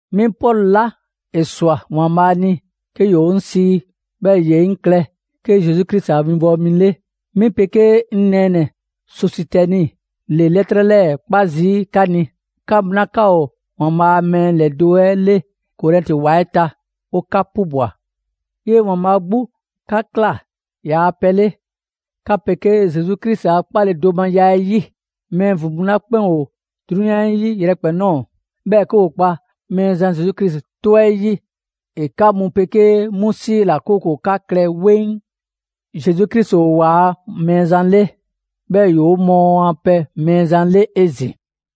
'Mi Pɔlu 'la ‑e ‑swa ‑Waanbhaa' ni 'ke ‑yoo 'ŋ sii, 'bhɛɛ‑ ‑ye 'ŋ ꞊klɛ 'ke Zesu Krisi a 'winbɔwo mi 'le, 'mi 'pegee 'ŋ nɛɛnɛ‑ Sɔsitɛni ‑le 'lɛtrɛ 'lɛɛ‑ 'kpa zii' 'ka ni, 'ka mu 'la 'ka ‑o ‑Waanbhaa' a mɛɛ ‑lɛdo' 'le Korɛnti ‑wa 'ɛ ta, 'o 'ka 'pubwa‑. 'Yee‑ ‑Waanbhaa' 'gbu 'ka ꞊kla ‑yaa' pɛ 'le, 'ka 'pegee Zesu Krisi a 'kpaledomaya 'ɛ 'yi. Mɛɛ ‑vin mu 'la 'kpɛn ‑o 'drunyan 'ɛ 'yi yrɛkpɛn‑ ꞊nɔɔ, 'bhɛɛ‑ 'ke ‑woo kpa Mɛɛzan Zesu Krisi 'tɔ 'ɛ 'yi, ‑e 'ka mu 'pegee 'mu 'siila‑, 'kooko‑ 'ka klɛ 'weŋ. Zesu Krisi ‑o ‑waa' Mɛɛzan 'le, 'bhɛɛ‑ ‑yoo' 'o mɔɔ a pɛ Mɛɛzan 'le 'ezin‑.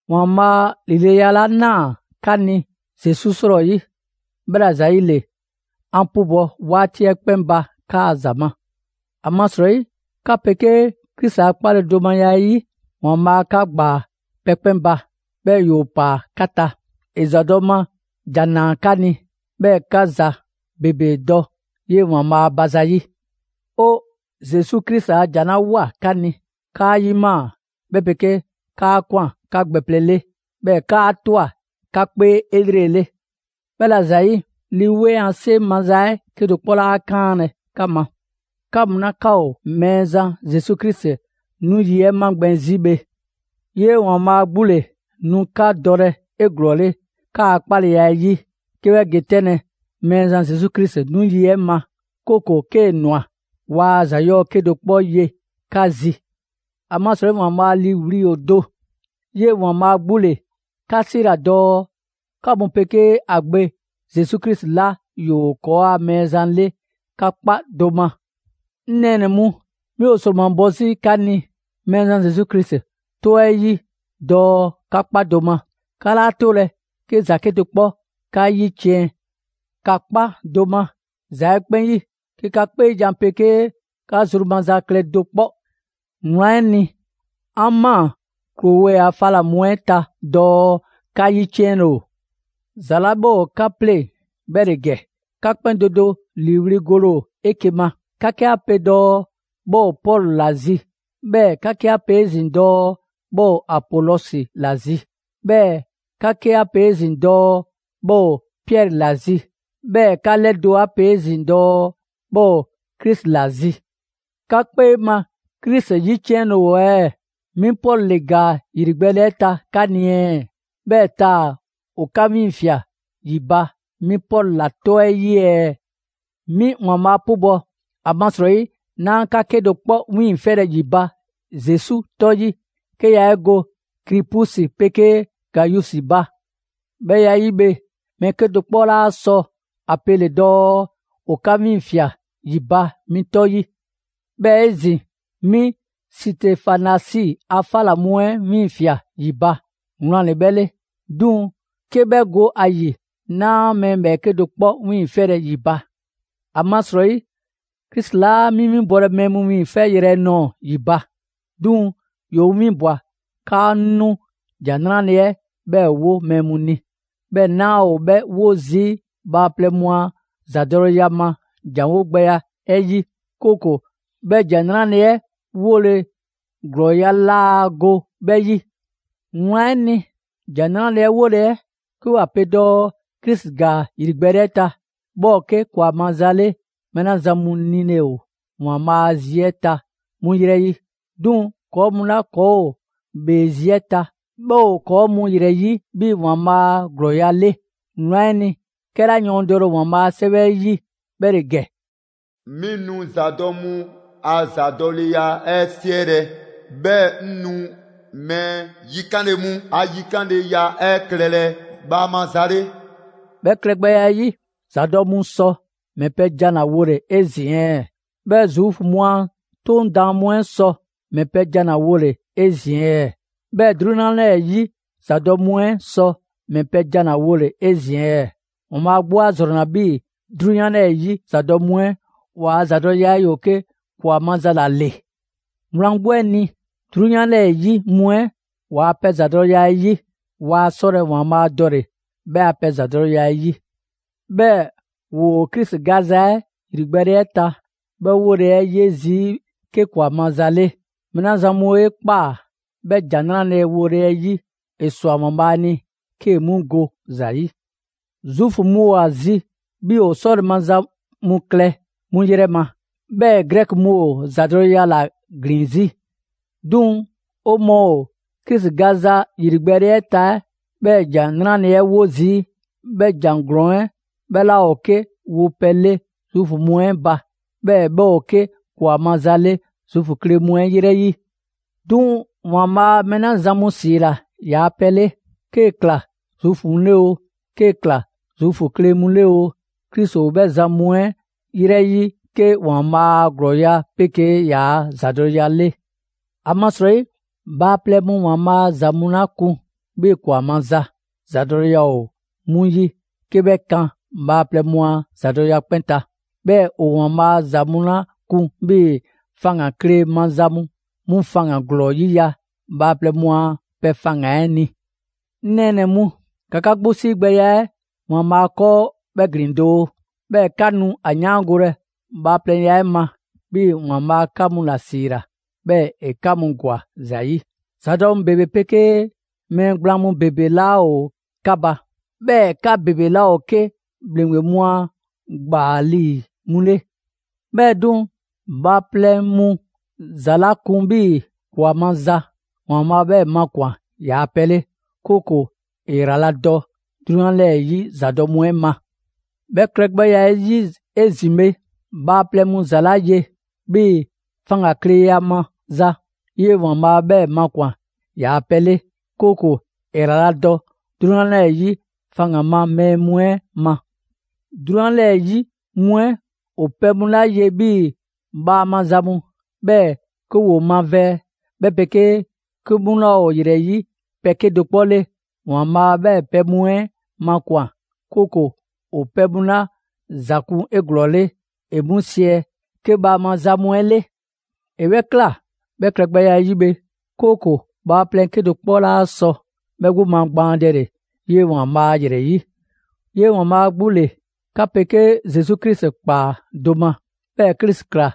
‑Waanbhaa' ‑lileya 'la 'naa‑ 'ka ni Zesu 'srɔyi, 'bhɛla‑ ‑zayile 'an 'pubɔ‑ 'waati 'ɛ 'kpɛn ba 'kaa‑ ‑za ma. ‑Amasrɔyi 'ka 'pegee Krisi a 'kpaledomaya 'ɛ 'yi, ‑Waanbhaa' 'ka ‑gbaa pɛ 'kpɛn ba, 'bhɛɛ‑ ‑yoo ‑paa 'ka ta. ‑E ‑zadɔ' ma ‑jan ‑naa 'ka ni, 'bhɛɛ‑ 'ka ‑za ‑bebe dɔ 'yee‑ ‑Waanbhaa' ba zayi'. 'O Zesu Krisi a ‑jan 'la ꞊woa 'ka ni, 'kaa 'yimaa‑, 'bhɛ 'pegee 'kaa ꞊kwan 'ka gbɛ plɛ 'le; 'bhɛɛ‑ 'kaa ꞊twa 'ka 'kpee 'elrele. 'Bhɛla‑ ‑zayi', Lii 'Weŋ a 'seŋ maza 'ɛ 'kedo‑ 'kpɔ 'laa 'kaanlɛ‑ 'ka ma; 'ka mu 'la 'ka ‑o Mɛɛzan Zesu Krisi 'nu yi 'ɛ magbɛn 'zi bhe. 'Yee‑ ‑Waanbhaa' 'gbu ‑le nu 'ka dɔlɛ 'eglɔɔle 'kaa‑ 'kpaleya 'ɛ 'yi 'ke 'bhɛ ge 'tɛnlɛ‑ Mɛɛzan Zesu Krisi 'nu yi 'ɛ ma; 'kooko‑ 'kee‑ ꞊nwa, waa ‑za 'yɔɔ‑ 'kedo‑ 'kpɔ ye 'ka zi. ‑Amasrɔyi ‑Waanbhaa' ‑liiwli' ‑o do. 'Yee‑ ‑Waanbhaa' 'gbu ‑le 'ka 'siila‑ dɔɔ 'ka mu 'pegee ‑a Gbe Zesu Krisi 'la ‑yoo ‑kɔɔa' Mɛɛzan 'le 'ka 'kpa do ma. 'Ŋ nɛɛnɛ‑ mu, 'mi ‑o ‑sromabɔ 'zi 'ka ni Mɛɛzan Zesu Krisi 'tɔ 'ɛ 'yi dɔɔ ‑ka 'kpa do ma. 'Ka 'laa 'tolɛ‑ 'ke ‑za 'kedo‑ 'kpɔ 'ka 'yiciɛn‑; ‑ka 'kpa do ma ‑za 'ɛ 'kpɛn 'yi, 'ke 'ka 'kpeejan‑ 'pegee 'ka zru maza klɛ do 'kpɔ. Wlan 'ɛ ni, 'an ꞊maa Klowe a 'fa 'la mu 'ɛ ta dɔɔ 'ka 'yiciɛnle ‑o. ‑Za 'la 'bhɛ ‑o 'ka 'pleŋ‑ 'bhɛ ‑le ‑gɛ: 'ka 'kpɛn do do ‑liiwli' gole ‑o 'eke‑ ma. 'Ka 'ke 'a pe dɔɔ 'bhɛ ‑o Pɔlu ‑la zi; 'bhɛɛ‑ 'ka 'ke 'a pe 'ezin‑ dɔɔ 'bhɛ ‑o Apolɔsi ‑la zi; 'bhɛɛ‑ 'ka 'ke 'a pe 'ezin‑ dɔɔ 'bhɛ ‑o Piɛri ‑la zi; 'bhɛɛ‑ 'ka 'lɛdo‑ 'a pe 'ezin‑ dɔɔ 'bhɛ ‑o Krisi ‑la zi. 'Ka 'kpee ma Krisi 'yiciɛnle ‑o ɛɛ? 'Mi Pɔlu ‑le ‑gaa ‑yrigbɛɛle 'ɛ ta 'ka ni ɛɛ? 'Bhɛɛ‑ taa‑ ‑o 'ka 'wiiŋfia꞊ ‑yi ba 'mi Pɔlu ‑la 'tɔ 'yi ɛɛ? 'Mi ‑Waanbhaa' 'pubɔ‑, ‑amasrɔyi 'naa 'ka 'kedo‑ 'kpɔ 'wiiŋfɛlɛ ‑yi ba Zesu 'tɔ 'yi; 'ke yaa 'e go Kripusi 'pegee Gayusi ba. 'Bhɛ ya 'ɛ 'yi bhe, mɛɛ 'kedo‑ 'kpɔ 'laa sɔ ‑a pele‑ dɔɔ ‑o 'ka 'wiiŋfia꞊ ‑yi ba 'mi 'tɔ 'yi. 'Bhɛɛ‑ 'ezin‑, 'mi Sitefanasi a 'fa ꞊la mu 'ɛ 'wiiŋfia꞊ ‑yi ba, wlan ‑le 'bhɛ 'le. 'Duŋ‑ 'ke 'bhɛ go ‑a ‑yi, 'naa mɛɛ ‑bhɛɛke' do 'kpɔ 'wiiŋfɛlɛ ‑yi ba. ‑Amasrɔyi Krisi 'laa 'mi 'winbɔlɛ mɛɛ mu wiiŋfɛyrɛ nɔɔ‑ ‑yi ba; 'duŋ‑ ‑yoo 'ŋ 'winbwa‑ 'kaa 'ŋ 'nu ‑Jan 'Nrale‑ 'ɛ 'bhɛɛ‑ 'wo mɛɛ mu ni. 'Bhɛɛ‑ 'naa ‑o 'bhɛ 'wo zii' bhaaplɛŋ mu a ‑zadɔleya ma ‑janwo' gbɛya 'ɛ 'yi, 'kooko‑ 'bhɛ ‑Jan 'Nrale‑ 'ɛ 'wole‑ ‑glɔɔya' laa go 'bhɛ 'yi. Wlan 'ɛ ni, ‑Jan 'Nrale‑ 'ɛ 'wole‑ 'ɛ 'ke 'wa pe dɔɔ Krisi ‑gaa ‑yrigbɛɛle 'ɛ ta, 'bhɛ ‑o 'ke ‑kwa maza 'le mɛɛ 'la zan mu nile ‑o ‑Waanbhaa' a zi 'ɛ ta 'mu 'yrɛ 'yi. 'Duŋ‑ ‑kɔɔ' mu 'la ‑kɔɔ' ‑o ‑bhee zi 'ɛ ta, 'bhɛ ‑o ‑kɔɔ' mu ‑yrɛ 'yi 'bhii‑ ‑Waanbhaa' a ‑glɔɔya' 'le. Wlan 'ɛ ni, 'kɛla yɔɔndɛle ‑o ‑Waanbhaa' a 'Sɛwɛ 'ɛ 'yi 'bhɛ ‑le ‑gɛ: «'Mi nu ‑zadɔ' mu a ‑zadɔleya 'ɛ 'siɛlɛ‑, 'bhɛɛ‑ 'ŋ nu mɛɛ yikanle mu a yikanleya 'ɛ klɛlɛ bhaama za 'le.» 'Bhɛ klɛgbɛya 'ɛ 'yi, ‑zadɔ' mu sɔ ‑mɛ pɛ jan ‑la wole‑ 'ezin‑ ɛɛ? 'Bhɛɛ‑ Zuufu mu a 'Toŋ daan mu 'ɛ sɔ ‑mɛ pɛ jan ‑la wole‑ 'ezin‑ ɛɛ? 'Bhɛɛ‑ 'drunyan 'lɛɛ‑ 'yi zaabɔ mu 'ɛ sɔ ‑mɛ pɛ jan ‑la wole‑ 'ezin‑ ɛɛ? ‑Waanbhaa' 'gbu 'a ‑zrɔnna 'bhii‑ 'drunyan 'lɛɛ‑ 'yi ‑zadɔ' mu 'ɛ ‑waa' zadɔleya 'ɛ ‑yoo 'ke ‑kwa maza ‑la ‑le. Wlan 'gbu 'ɛ ni, 'drunyan 'lɛɛ‑ 'yi mu 'ɛ ‑waa' pɛ ‑zadɔleya 'ɛ 'yi, waa 'sɔlɛ‑ ‑Waanbhaa' dɔle‑ 'bhɛ a pɛ ‑zadɔleya 'ɛ 'yi. 'Bhɛɛ‑ ‑woo Krisi gaza 'ɛ ‑yrigbɛɛle 'ɛ ta 'bhɛ 'wole‑ 'ɛ 'ye zii' 'ke ‑kwa maza 'le; mɛɛ 'la zan mu 'e ꞊kpaa 'bhɛ ‑Jan 'Nrale‑ wole 'ɛ 'yi, ‑e ‑swa ‑Waanbhaa' ni 'kee‑ 'mu go ‑za 'yi. Zuufu mu ‑o ‑a zi 'bhii‑ 'o 'sɔle‑ maza mu klɛ 'mu ‑yrɛ ma, 'bhɛɛ Grɛki mu ‑o ‑zadɔleya ‑la ‑glin 'zi. 'Duŋ‑ 'o mɔɔ ‑o Krisi gbaanza ‑yrigbɛɛle 'ɛ ta 'bhɛ ‑jan 'nrale‑ 'ɛ 'wo zii', 'bhɛ ‑jan ‑glɔɔn 'ɛ 'bhɛ 'laa ‑o 'ke wopɛ 'le Zuufu mu 'ɛ ba, 'bhɛɛ‑ 'bhɛ ‑o 'ke ‑kwa maza 'le Zuufu kle mu 'ɛ 'yrɛ 'yi. 'Duŋ‑ ‑Waanbhaa' mɛɛ 'la zan mu ‑siila ‑yaa' pɛ 'le, 'kee‑ ‑kla Zuufu mu 'le oo, 'kee‑ ‑kla Zuufu kle mu 'le oo; Krisi ‑o 'bhɛ zan mu ‑yrɛ 'yi 'ke ‑Waanbhaa' a ‑glɔɔya' 'pegee ‑yaa' ‑zadɔleya 'le. ‑Amasrɔyi bhaaplɛŋ mu ‑Waanbhaa' a ‑za mu 'la kun 'bhii‑ ‑kwa maza, ‑zadɔleya ‑o 'mu 'yi 'ke 'bhɛ kan bhaaplɛŋ mu a ‑zadɔleya 'kpɛn ta. 'Bhɛɛ‑ ‑o ‑Waanbhaa' a ‑za mu 'la kun 'bhii‑ faŋgan‑ kle maza mu, 'mu faŋgan‑ ‑glɔɔ 'yiya‑ bhaaplɛŋ mu a pɛ faŋgan‑ 'ɛ ni. 'Ŋ nɛɛnɛ‑ mu, ‑ka 'ka 'gbu 'siigbɛya 'ɛ ‑Waanbhaa' 'kɔɔ 'bhɛ ‑glin doo, 'bhɛɛ‑ 'ka nu ‑a 'yaangolɛ bhaaplɛŋya 'ɛ ma, 'bhii‑ ‑Waanbhaa' 'ka mu 'la 'siila‑, 'bhɛɛ‑ ‑e 'ka ‑gwa ‑za ‑yi; ‑zadɔ' mu ‑bebe 'pegee mɛɛ gblaan ‑bebe 'laa ‑o 'ka ba, 'bhɛɛ‑ 'ka ‑bebe 'laa ‑o 'ke ‑bhleŋgbe mu a ‑gbaa ‑lii mu 'le. 'Bhɛɛ‑ 'duŋ‑, bhaaplɛŋ mu ‑za 'la kun 'bhii‑ ‑kwa maza, ‑Waanbhaa' 'bhɛɛ‑ makwan‑ ‑yaa' pɛ 'le, 'kooko‑ ‑e ‑yraladɔ 'drunyan 'lɛɛ‑ 'yi ‑zadɔ' mu 'ɛ ma. 'Bhɛ klɛgbɛya 'ɛ 'yi 'ezin‑ bhe, bhaaplɛŋ mu ‑za 'la ye 'bhii‑ faŋgankleya maza, 'yee‑ ‑Waanbhaa' 'bhɛɛ‑ makwan‑ ‑yaa' pɛ 'le, 'kooko‑ ‑e ‑yraladɔ 'drunyan 'lɛɛ‑ 'yi faŋgan‑ ma mɛɛ mu 'ɛ ma. 'Drunyan 'lɛɛ‑ 'yi mu 'ɛ ‑o pɛ mu 'la ye 'bhii‑ bhaama za mu, 'bhɛɛ‑ 'ke ‑woo mavɛɛ, 'bhɛ 'pegee 'ke 'mu 'laa ‑o ‑yrɛ 'yi pɛ 'kedo‑ 'kpɔ 'le, ‑Waanbhaa' 'bhɛɛ‑ pɛ mu 'ɛ makwan‑; 'kooko‑ ‑o pɛ mu 'la ‑za kun 'eglɔɔle ‑e 'mu siɛ 'ke bhaama za mu 'ɛ 'le. ‑E 'bhɛ ꞊kla 'bhɛ klɛgbɛya 'ɛ 'yi bhe, 'kooko‑ bhaaplɛŋ 'kedo‑ 'kpɔ 'laa sɔ 'bhɛ 'gbu magbaandɛle 'yee‑ ‑Waanbhaa' ‑yrɛ 'yi. 'Yee‑ ‑Waanbhaa' 'gbu ‑le 'ka 'pegee Zesu Krisi ꞊kpaa do ma, 'bhɛɛ‑ Krisi ‑kla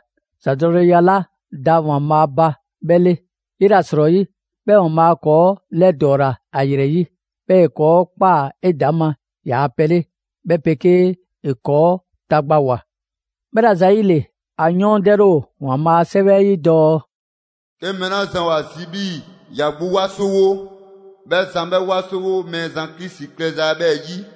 ‑zadɔleya 'la da ‑Waanbhaa' ba 'bhɛ 'le. 'Yela‑ 'srɔyi, 'bhɛɛ‑ ‑Waanbhaa' ‑kɔɔ' 'lɛdɔɔla ‑a ‑yrɛ 'yi, 'bhɛɛ‑ ‑e ‑kɔɔ' ꞊kpaa 'edaŋma ‑yaa' pɛ 'le, 'bhɛ 'pegee ‑e ‑kɔɔ' tagbawoa. 'Bhɛla‑ ‑zayile, ‑a yɔɔndɛle ‑o ‑Waanbhaa' a 'Sɛwɛ 'ɛ 'yi dɔɔ: «'Ke mɛɛ 'la zan ‑o ‑a zi 'bhii‑ ‑ya 'gbu 'wasowo, 'bhɛ zan 'bhɛ 'wasowo Mɛɛzan Krisi klɛza 'ɛ 'bhɛɛ‑ 'yi.»